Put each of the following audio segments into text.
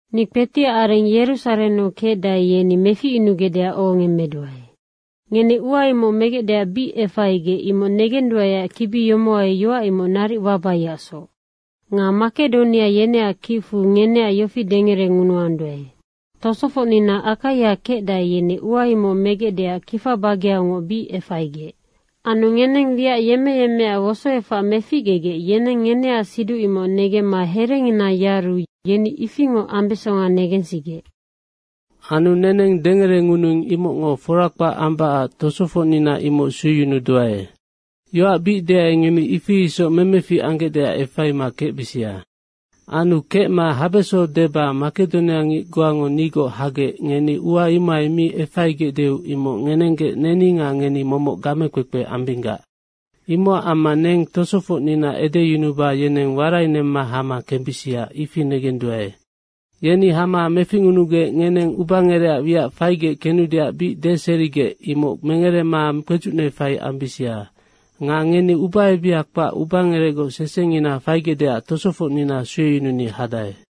Ni kpetiac areng Yerusarennu kecdae, yeni meficyunugecdeac ohongemmeduae. Ngeni ua imoc megecdeac bic efaigec, imoc negenduaeac kibi yomohai yoac imoc naric wabaiacsoc. Nga Makedonia yeneac kicfu ngeneac yofi dengerengunuanduae, “Tosofocnina Akaia kecdae, yeni ua imoc megecdeac kifa bageaungoc bic efaigec.” Anu ngeneng wiac yemmeyemmeac wosoefac meficgegec yeneng ngeneac siduc imoc negemma herengina yaru yeni ifingoc ambesonga negensigec. Anu neneng dengerengunuing, imocngo fora kpac ambacac tosofocnina imoc sueyunuduae. Yoac bic deai, ngeni ifi isoc memefic anggecdeac efaima kecbisia. Anu kecma habeso deba Makedonia ngic goango nigoc hagec ngeni ua imohai mi efaigecdeu imoc ngenenggec neni nga ngeni momoc gamekpekpe ambinggac. Imocac amma neng tosofocnina edeyunuba yeneng warainemma hama kembisia, ifi negenduae. Yeni hama meficngunugec ngeneng ubangerecac wiac faigec kenudeac bic deserigec, imoc mengerema kpedzucne fai ambisia. Nga ngeni ubaebiha kpac ubangerecgoc sesengina faigecdeac tosofocnina sueyununi hadae.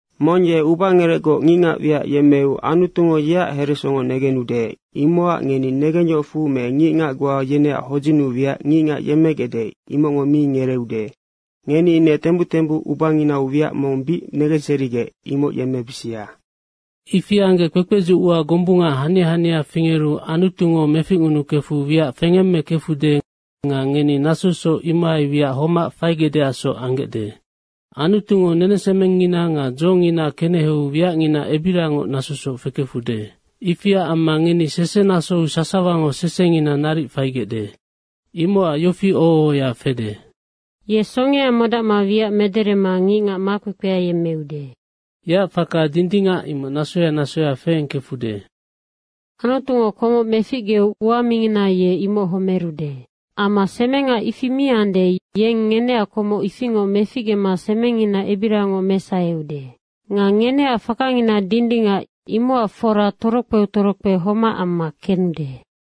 Mong ye ubangerecgoc ngicngac wiac yemmeu Anutungo yeac heresongo negenude. Imocac ngeni negengyohocfu me ngicngac goa yeneac hodzinnu wiac ngicngac yemmegecde, imocngo mi ngereeude. Ngeni ine tembuc tembuc ubanginau wiac mong bic negenserigec, imoc yemmebisia. Ifi anggec kpekpedzuc ua gombunga hania hania fingeru Anutungo meficngunukefu wiac fengemmekefude nga ngeni nasosoc imohai wiac homac faigecdeacsoc anggecde. Anutungo nenesemengngina nga dzongina keneheu wiacngina ebirangoc nasosoc fekefude. Ifiac amma ngeni sesenasou sasawango sesengina naric faigecde. Imocac yofi oho ohoya fede, “Ye songea modacma wiac mederema ngicngac makpekpea yemmeude. Yeac faka dindingac, imoc nasoya nasoya feengkefude.” Anutungo komoc meficgeu ua mingina ye imoc homerude. Amma semenga ifi miande, yeng ngeneac komoc ifingoc meficgema semengngina ebirangoc mesaheude. Nga ngeneac fakangina dindingac, imocac fora torokpeu torokpe homac amma kenude.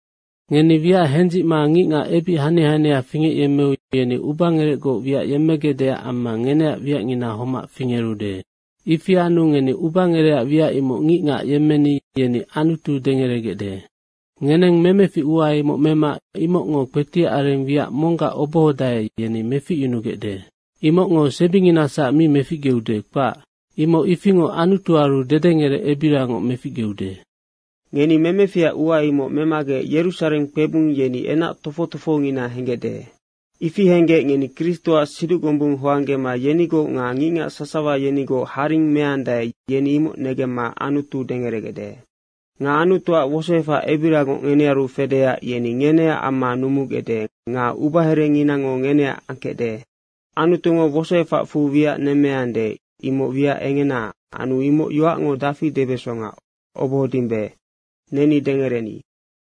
Ngeni wiac hendzicma ngicngac ebic hania hania fingecyemmeu yeni ubangerecgoc wiac yemmegecdeac amma ngeneac wiacngina homac fingerude. Ifi anu neni ubangerecac wiac imoc ngicngac yemmeni yeni Anutu dengeregecde. Ngeneng memefic ua imoc mema, imocngo kpetiac areng wiac monggac obohodae, yeni meficyunugecde. Imocngo sebinginasac mi meficgeude, kpac. Imoc ifingoc Anutuaru dedengerec ebirangoc meficgeude. Ngeni memeficac ua imoc memagec Yerusareng kpebung yeni enac tofoc tofohongina henggecde. Ifi henggec ngeni Kristoac siduc gombung hoanggema yenigoc nga ngicngac sasawa yenigoc haring meandae, yeni imoc negemma Anutu dengeregecde. Nga Anutuac wosoefac ebirangoc ngenearu fedeac yeni ngeneac amma numugecde nga ubaherenginango ngeneac angkecde. Anutungo wosoefacfu wiac nemmeande imoc wiac engena anu imoc yoacngo dafi debesonga obohodimbe. Neni dengereni.